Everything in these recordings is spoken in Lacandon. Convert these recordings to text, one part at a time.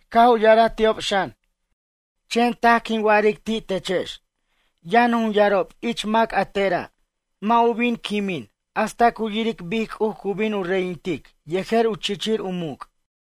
Caj u ya'araj ti'ob xan: ―Chen taj quin wa'aric ti' techex, yʌn jun yarob ich mac a tera' mʌ' u bin quimin hasta cu yiric bic C'uj cu bin u reyintic yejer u chichir u muc'.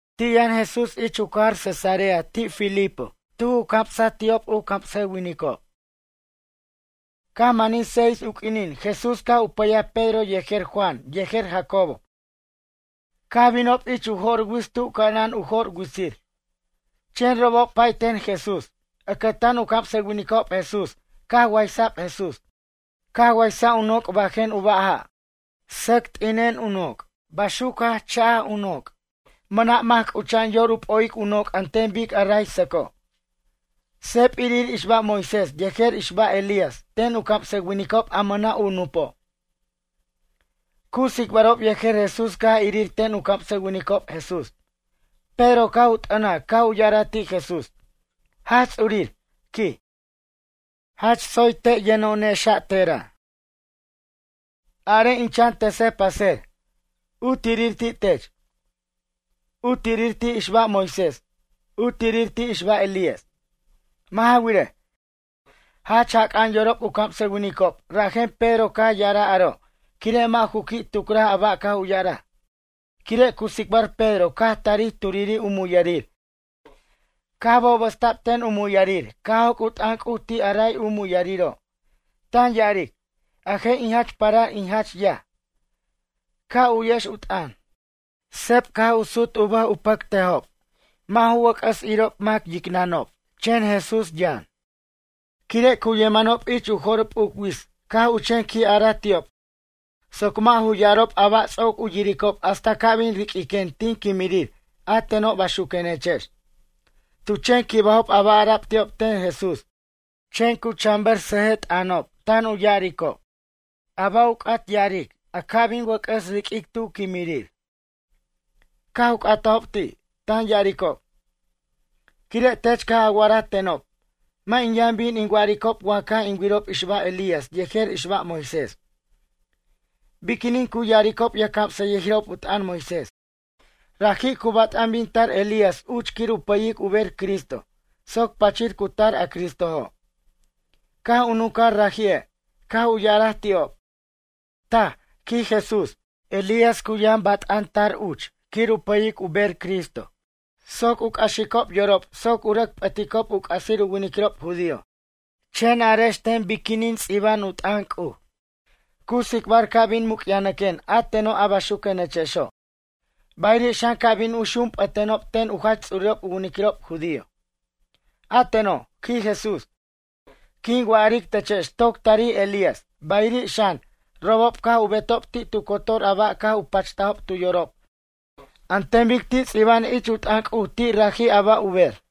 Ti' yʌn Jesús uch ich u cajar Cesarea de Filipo tuj u camsaj ti'ob u camsʌwinicob. Caj manij seis u q'uinin Jesús caj u pʌyaj Pedro yejer Juan yejer Jacobo. Caj binob ich u jo'r wits tu ca'anan u jo'r witsir. Chen robob pay ten Jesús. Ʌcʌtan u camsʌwinicob Jesús caj waysa'b Jesús. Caj waysa' u noc' bajen u ba' ja', sʌc t'ina'an u noc', baxuc jach cha'aj u noc'. Mʌna' mac c'ucha'an yor u p'o'ic u noc' an ten bic a ray sʌco'. Seb irir ixbaj Moisés yejer ixbaj Elías ten u camsʌwinicob a mʌna' u nupo'. Cu tsicbarob yejer Jesús caj irir ten u camsʌwinicob Jesús. Pedro caj u t'ʌnaj caj u ya'araj ti' Jesús: ―Jaj Ts'urir ―quij―, jach tsoy te' yʌno'onexa' tera'. Arej in chan tʌsej paser, u tirir ti' tech, u tirir ti' ixbaj Moisés, u tirir ti' ixbaj Elías. Mʌ' ja wirej, jach jac'a'an yorob u camsʌwinicob rajen Pedro caj ya'araj aro' quire' mʌ' ju qui' tucraj a ba' caj u ya'araj. Quire' cu tsicbar Pedro caj tarij turiri' u muyʌrir caj bobʌsta'b ten u muyʌrir caj joc' u t'ʌn C'uj ti' a ray u muyʌriro', tan ya'aric: ―A je' in jach parar in jach yaj. Ca' u'yex u t'ʌn. Seb caj u sut u bʌj pacatnʌjobe' mʌ' ju wʌc'ʌs irob mac yicnʌnob, chen Jesús yʌn. Quire' cu yemanob ich u jo'r p'uc wits caj u chen qui' araj ti'ob soc mʌ' ju ya'arob a ba' ts'oc u yiricob hasta ca' bin riq'uiquen tin quimirir a teno' a baxuquenechex. Tu chen quibajob a ba' ara'b ti'ob ten Jesús, chen cu chan ber sʌjʌj t'ʌnob tan u ya'aricob: ―A ba' u c'at ya'aric a ca' bin wʌc'ʌs riq'uic tu quimirir? Caj u c'atajob ti', tan ya'aricob: ―Quire' tech caj a wa'araj tenob, mʌ' in yʌn bin in wa'aricob wa caj in wirob ixbaj Elías yejer ixbaj Moisés. Biquinin cu ya'aricob yʌjcamsʌyʌjirob u t'ʌn Moisés: “Raji' cu bat'an bin tar Elías uch quir u pʌyic u ber Cristo soc pachir cu tar a Cristojo'”? Caj u nuncaj raji'e', caj u ya'araj ti'ob: ―Taj ―quij Jesús―. Elías cu yʌn bat'an tar uch quir u pʌyic u bej Cristo soc u c'axicob yorob soc u rʌc p'ʌticob u c'asir u winiquirob judío. Chen arex ten biquinin u ts'iba'an t'ʌn C'uj cu tsicbar ca' bin muc'yajnʌquen a teno' a baxuquenechexo', bayiri' xan ca' bin u xunp'ʌtenob ten u jach ts'urirob u winiquirob judío. A teno' ―quij Jesús―, quin wa'aric techex toc tarij Elías, bayiri' xan, robob caj u betob ti' tu cotor a ba' caj u pachtajob tu yorob an ten bic ti' ts'iba'an ich u t'ʌn C'uj ti' raji' a ba' u ber.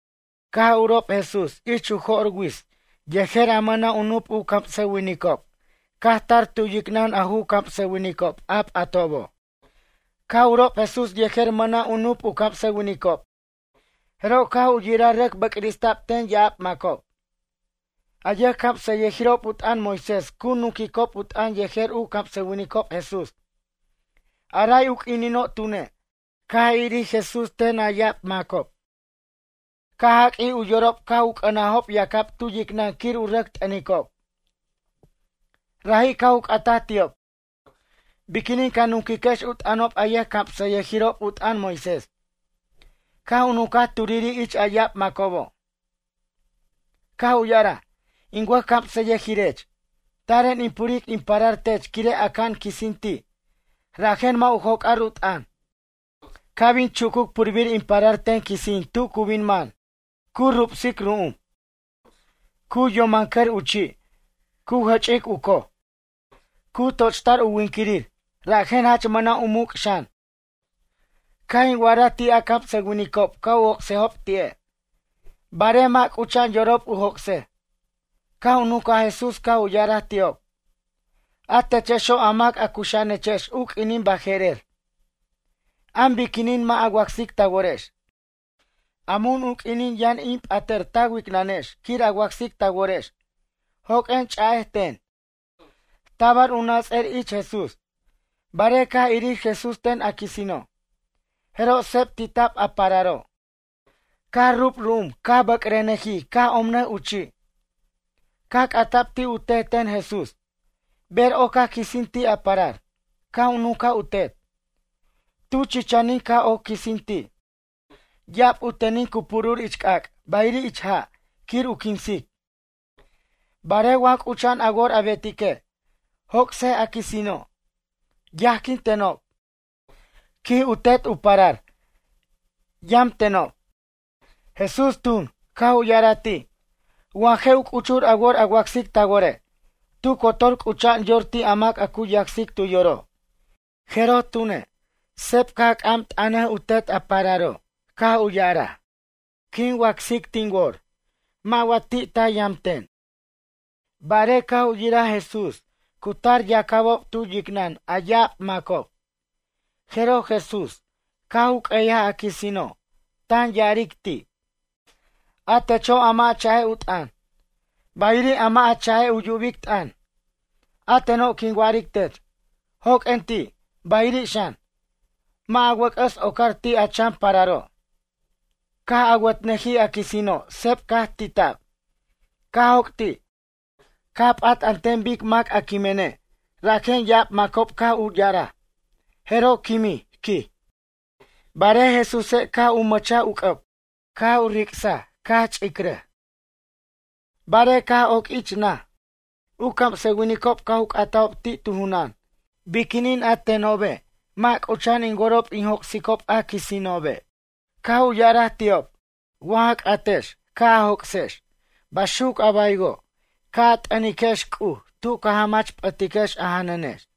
Caj urob Jesús ich u jo'r wits yejer u mʌna' u nup camsʌwinicob caj tar tu yicnʌn a ju camsʌwinicob a p'atobo'. Caj urob Jesús yejer mʌna' u nup u camsʌwinicob jeroj caj u yiraj rʌc bʌcrista'b ten ya'ab macob. A yʌjcamsʌyʌjirob u t'ʌn Moisés cu nunquicob u t'ʌn yejer u camsʌwinicob Jesús. A ray u q'uinino' tune', caj irir Jesús ten a ya'ab macob caj jaq'uij u yorob caj u c'ʌnajob yacab tu yicnʌn quir u rʌc t'ʌnicob. Raji' caj u c'ataj ti'ob: ―Biquinin ca nunquiquex u t'ʌnob a yʌjcamsʌyʌjirob u t'ʌn Moisés? Caj u nuncaj turiri' ich a ya'ab macobo', caj u ya'araj: ―In wʌjcamsʌyʌjirech, taren in puric in parar tech quire' aca'an quisin ti', rajen mʌ' u joc'ar u t'ʌn. Ca' bin chucuc purbir in parar ten quisin tu cu bin man, cu rubsic ru'um, cu yomancʌr u chi', cu jʌch'ic u coj, cu tochtar u winquirir rajen jach mʌna' u muc' xan. Caj in wa'araj ti' a camsʌwinicob ca' u joc'sejob ti'e', barej mʌ' c'ucha'an yorob u joc'sej. Caj u nuncaj Jesús caj u ya'araj ti'ob: ―A techexo' a mac a cuxa'anechex u q'uinin baje'rer, am biquinin mʌ' a wacsic ta worex? A mun u q'uinin yʌn in p'atʌr ta wicnʌnex quir a wacsic ta worex? Joq'uen ch'a'ej ten. Tabar u nats'ʌr ich Jesús, barej caj irir Jesús ten a quisino', jeroj seb tit'ab a pararo', caj rub ru'um caj bʌcrʌnʌjij caj omnʌj u chi'. Caj c'ata'b ti' u tet ten Jesús: ―Ber ocac quisin ti' a parar? Caj u nuncaj u tet: ―Tu chichanin caj oc quisin ti'. Ya'ab u tenin cu purur ich c'ac' bayiri' ich ja' quir u quinsic. Barej wa c'ucha'an a wor a betique', joc'sej a quisino'. Yajquintenob ―quij u tet u parar―, yʌm tenob. Jesús tun, caj u ya'araj ti': ―Wa je' u c'uchur a wor a wacsic ta wore', tu cotor c'ucha'an yor ti' mac a cu yacsic tu yoro'. Jeroj tune', seb caj c'am t'ʌnaj u tet a pararo', caj u ya'araj: ―Quin wacsic tin wor, wa mʌ' ti'ti' yam ten. Barej caj u yiraj Jesús, cu tar yacabob tu yicnʌn a ya'ab macob, jeroj Jesús caj u q'ueyaj a quisino', tan ya'aric ti': ―A techo' a mʌ' a cha'ej u t'ʌn, bayiri' a mʌ' a cha'ej u yubic t'ʌn. A teno' quin wa'aric tech, joq'uen ti', bayiri' xan, mʌ' a wʌc'ʌs ocar ti' a chan pararo'. Caj awatnʌjij a quisino' seb caj tita'b, caj joc' ti', caj p'at an ten bic mac a quimene', rajen ya'ab macob caj u ya'araj: “Jeroj quimij, quij.” Barej Jesúse' caj u mʌchaj u c'ʌb, caj u ric'saj caj ch'iraj. Barej caj oc ich naj, u camsʌwinicob caj u c'atajob ti' tu junan: ―Biquinin a tenobe' mʌ' c'ucha'an in worob in joc'sicob a quisinobi'? Caj u ya'araj ti'ob: ―Wa ja c'atex ca' a joc'sex baxuc a baywo' ca' a t'ʌniquex C'uj tu ca jamach p'ʌtiquex a janʌnex.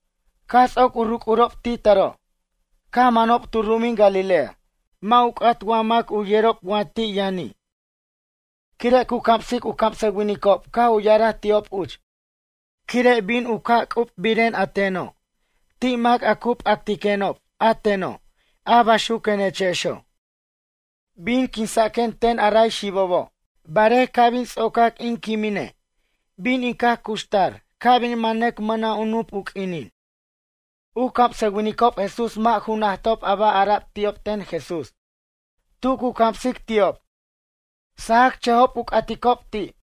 Caj ts'oc u ruc'urob ti' taro', caj manob tu ru'umin Galilea. Mʌ' ju c'at wa mac u yerob wa ti' yʌni'. Quire' cu camsic u camsʌwinicob caj u ya'araj ti'ob uch: ―Quire' bin u caj c'ubiren a teno' ti' mac a cu p'actiquenob a teno' a baxuquenechexo'. Bin quinsaquen ten a ray xibobo', barej ca' bin ts'ocac in quimene' bin in caj cuxtar ca' bin manʌc mʌna' u nup u q'uinin. U camsʌwinicob Jesús mʌ' ju najtob a ba' ara'b ti'ob ten Jesús, tu cu camsic ti'ob, sajacchʌjob u c'aticob ti'.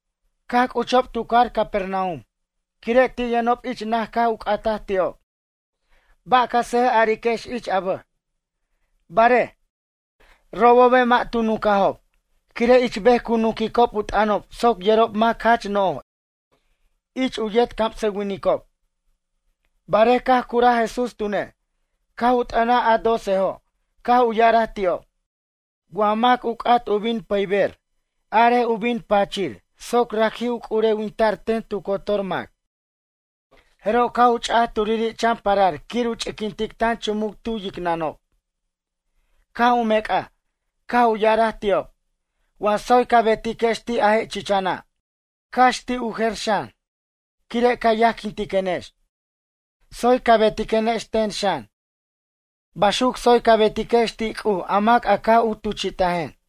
Caj c'uchob tu cajar Capernaum. Quire' ti' yʌnob ich naj caj u c'ataj ti'ob: ―Ba' ca sʌjʌj ariquex ich a bej? Barej, robobe' mʌ' tu nuncajob, quire' ich bej cu nunquicob u t'ʌnob soc yerob mac jach no'j ich u yet camsʌwinicob. Barej caj curaj Jesús tune', caj u t'ʌnaj a docejo' caj u ya'araj ti'ob: ―Wa mac u c'at bin pʌyber arej u bin pachir soc raji' u c'urewinta'r ten tu cotor mac. Jeroj caj u ch'a'aj turiri' chan parar quir u ch'iquintic tan chumuc tu yicnʌnob, caj u mec'aj, caj u ya'araj ti'ob: ―Wa tsoy ca betiquex ti' a je' chichana', cax ti' u jer xan, quire' ca yajquintiquenex. Tsoy ca betiquenex ten xan. Baxuc tsoy ca betiquex ti' C'uj a mac a caj u tuchi'tajen.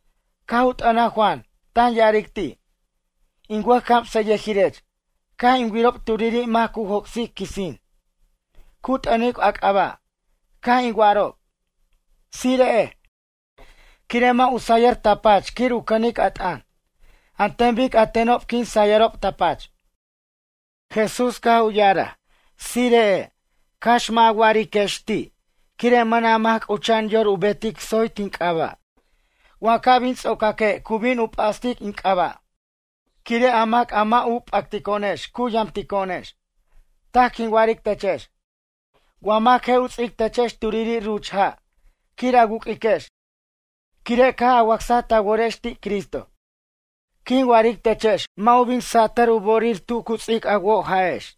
Caj u t'ʌnaj Juan, tan ya'aric ti': ―In wʌj camsʌyʌjirech, caj in wirob turiri' mac cu joc'sic quisin. Cu t'ʌnic a c'aba'. Caj in wa'arob: “Tsire'ej”, quire' mʌ' u sayʌr ta pach quir u cʌnic a t'ʌn, an ten bic a tenob quin sayʌrob ta pach. Jesús caj u ya'araj: ―Tsire'ej, cax mʌ' a wa'ariquex ti' quire' mʌna' mac c'ucha'an yor u betic tsoy tin c'aba' wa ca' bin ts'ocaque' cu bin u p'astic in c'aba'. Quire' a mac a mʌ' u p'actico'onex cu yamtico'onex. Taj quin wa'aric techex, wa mac je' u ts'ic techex turiri' ruch ja' quir a wu'q'uiquex quire' caj a wacsaj ta worex ti' Cristo, quin wa'aric techex mʌ' u bin satʌr u bo'orir tu cu ts'ic a woj ja'ex.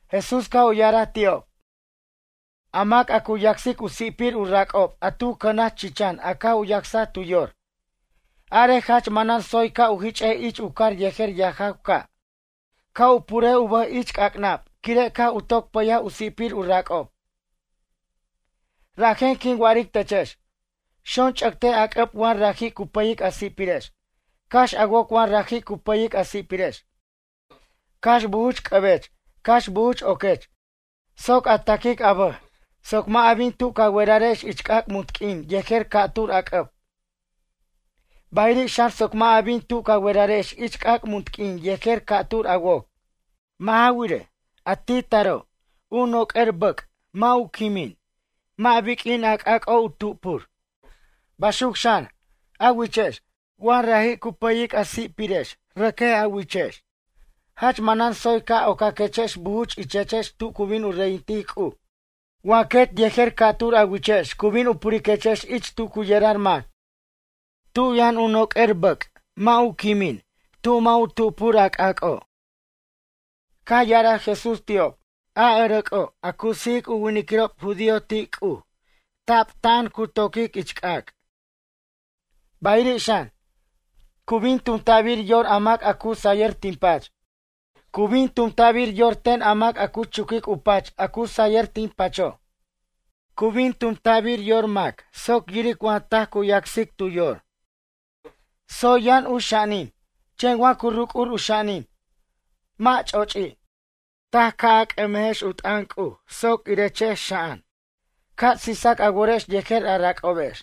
Jesús caj u ya'araj ti'ob: ―A mac a cu yacsic u si'pir u rac'ob a tu cʌnaj chichan a caj u yacsaj tu yor. Arej jach manan tsoy ca' u jich'ej ich u car yejer yajaw ca'. Ca' u purej u bʌj ich c'ac'nab quire' caj u toc pʌyaj u si'pir u rac'ob. Rajen quin wa'aric techex: Xonch'ʌtej a c'ʌb wa raji' cu pʌyic a si'pirex. Cax a woc wa raji' cu pʌyic a si'pirex. Cax bujuch c'ʌbech cax bujuch oquech soc a taquic a bʌj soc mʌ' a bin tu ca werarex ich c'ac' munt q'uin yejer ca'tur a c'ʌb, bayiri' xan soc mʌ' a bin tu ca werarex ich c'ac' munt q'uin yejer ca'tur a woc. Mʌ' ja wirej, ti' taro' u noq'uer bʌc' mʌ' u quimin, mʌ' biq'uin a c'ac'o' u tupur. Baxuc xan, a wichex. Wa raji' cu pʌyic a si'pirex rʌquej a wichex, jach manan tsoy ca' ocaquechex bujuch ichechex tu cu bin u reyintic C'uj wa quet yejer ca'tur a wichex cu bin u puriquechex ich tu cu yerar mac. Tu yʌn noc'or bʌc' mʌ' u quimin, tu mʌ' u tupur a c'ac'o'. Caj ya'araj Jesús ti'ob: ―A ʌrʌc'o' a cu sijic u winiquirob judío ti' C'uj tabta'an cu toquic ich c'ac'. Bayiri' xan, cu bin tumta'bir yor a mac a cu sayʌr tin pach. Cu bin tumta'bir yor ten a mac a cu chuquic u pach a cu sayʌr tin pacho'. Cu bin tumta'bir yor mac soc yiric wa taj cu yacsic tu yor. Tsoy yʌn u xa'anin, chen wa cu ruc'ur u xa'anin, mʌ' ch'o'ochi'. Taj ca c'ʌmejex u t'ʌn C'uj soc irechex xa'an. Ca' sisac a worex yejer a rac'obex.